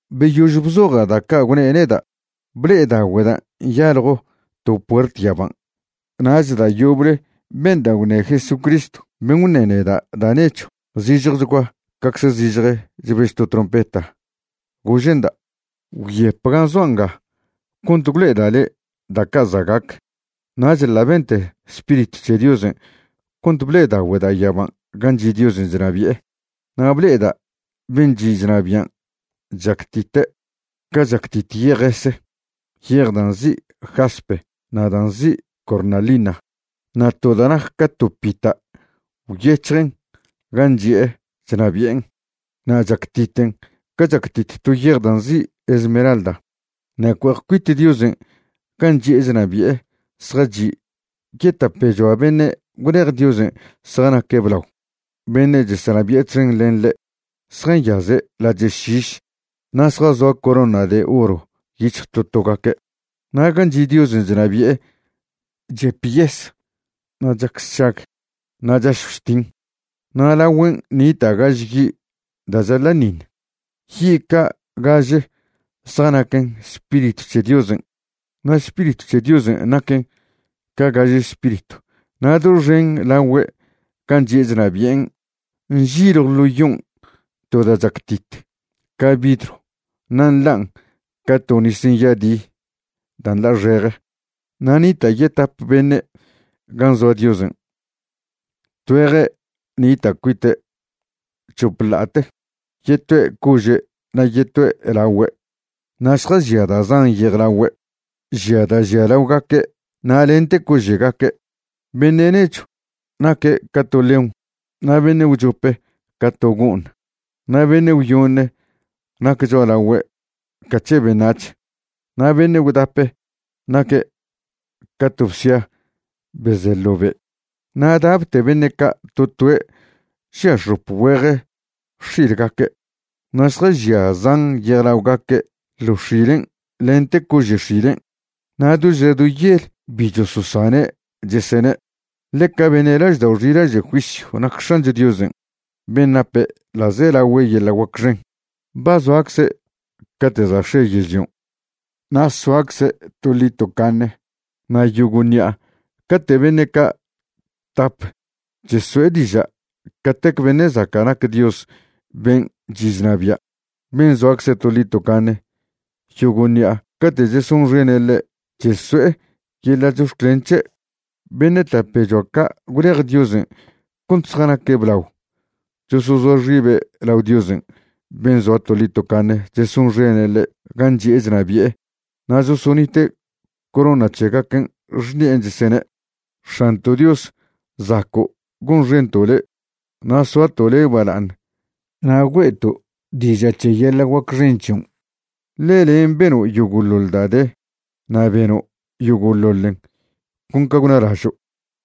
Beyož bzoja' da' ca' gwne' neda', ble'edaogüeda' nyaljo to puert yaban'. Nach da' yoble benda' gwṉe Jesucristw ben' gwṉe neda' da' nechw zižjechgua cacze zižje chbež to trompeta, gože'nda': ―Gwyep gan' zoa' nga cont gwlo'eda' le' da' ca' za' gac. Nach ḻa' bente Spiritw c̱he Diosen' cont ble'edaogüeda' yaban' gan' chi' Diosen' chnabi'e. Na' ble'eda' ben' chi' chnabian' chactite' ca chactit yejese, yej da' nzi' jaspe na' da' nzi' cornalina. Na' to da' nac ca to pita' gwyec̱hjen gan' chi'e chnabi'en, na' chactiten ca chactit to yej da' nzi' esmeralda. Na' cue'ej cuit Diosen' gan' chi'e chnabi'e zjachi' yetapechoa beṉe' gwlej Diosen' zjanaque' blao, beṉe' chesenabi'e txen len ḻe'. Zjanyaze' lache' šiš na' zjazoa corona de oro yic̱hj to togaque'. Na' gan' chi' Diosen' chnabi'e chep yes na' chac sšag na' chašjw chtin. Na' lagüen' nita' gaže yi' da' chaḻa'ṉiṉ. Yi' ca' gaže zjanaquen Spiritw c̱he Diosen', na' Spiritw c̱he Diosen' naquen ca gaže spiritw. Na' doxen lagüe' gan' chi'e chnabi'en nžiljw ḻo yon' to da' chactit ca vidrw na' nḻan' ca to nis nyadi da' nḻa'xeje. Na' nita' yetap beṉe' gan' zoa Diosen'. Tgüeje' nita' cuite' chop ḻa'ate, yetoe' cože' na' yetoe' lagüe', na' zjažia da' zan yejlaogaque', žia da' žia laogaque' na' lente cože'gaque'. Beṉe' nechw naque' ca to león, na' beṉe' gwchope ca to go'ṉ, na' beṉe' gwyoṉe nac cho'alagüe' ca c̱he beṉac̱h, na' beṉe' gwdape naque' ca to bsia be ze ḻo be'. Na' dapte beṉe' ca' to toe' žia x̱op güeje x̱ilgaque', na' zjažia zan yejlaogaque' ḻo x̱ilen' lente cože' x̱ilen'. Na' do ža do yel bi chososane' chesene': Ḻeca beṉe' laždao' xilaže' juisyw nac X̱ancho Diosen' ben' nape ḻa'zelagüe yeḻa' guac xen. Ba zoacze' cate' za' x̱e yežlion', na' soacze' toḻi tocaṉe. Na' yogo' ṉi'a cate' beṉe' ca' tap cheso'e diža' catec beṉe' zaca' nac Dios ben' chi' chnabia', ben' zoacze toḻi tocaṉe, yogo' ṉi'a cate' chesonxene' ḻe' cheso'e yeḻa' chox̱clen c̱he', beṉe' tapechoa ca' gwlej Diosen' cont zjanaque' blao chosozoa xibe' lao Dios ben' zoa toḻi tocaṉe chesonxene' ḻe' gan' chi'e chnabi'e na' chosonite' corona c̱hegaquen' xṉi'en, chesene': X̱anto' Dios, zaco' gonxento' le', na' soato' le' bala'aṉ na' güe'to' diža' c̱he yeḻa' guac xen c̱hion', ḻe len' beno' yogo'ḻoḻ da' de, na' beno' yogo'ḻoḻen con ca gwnalažo'.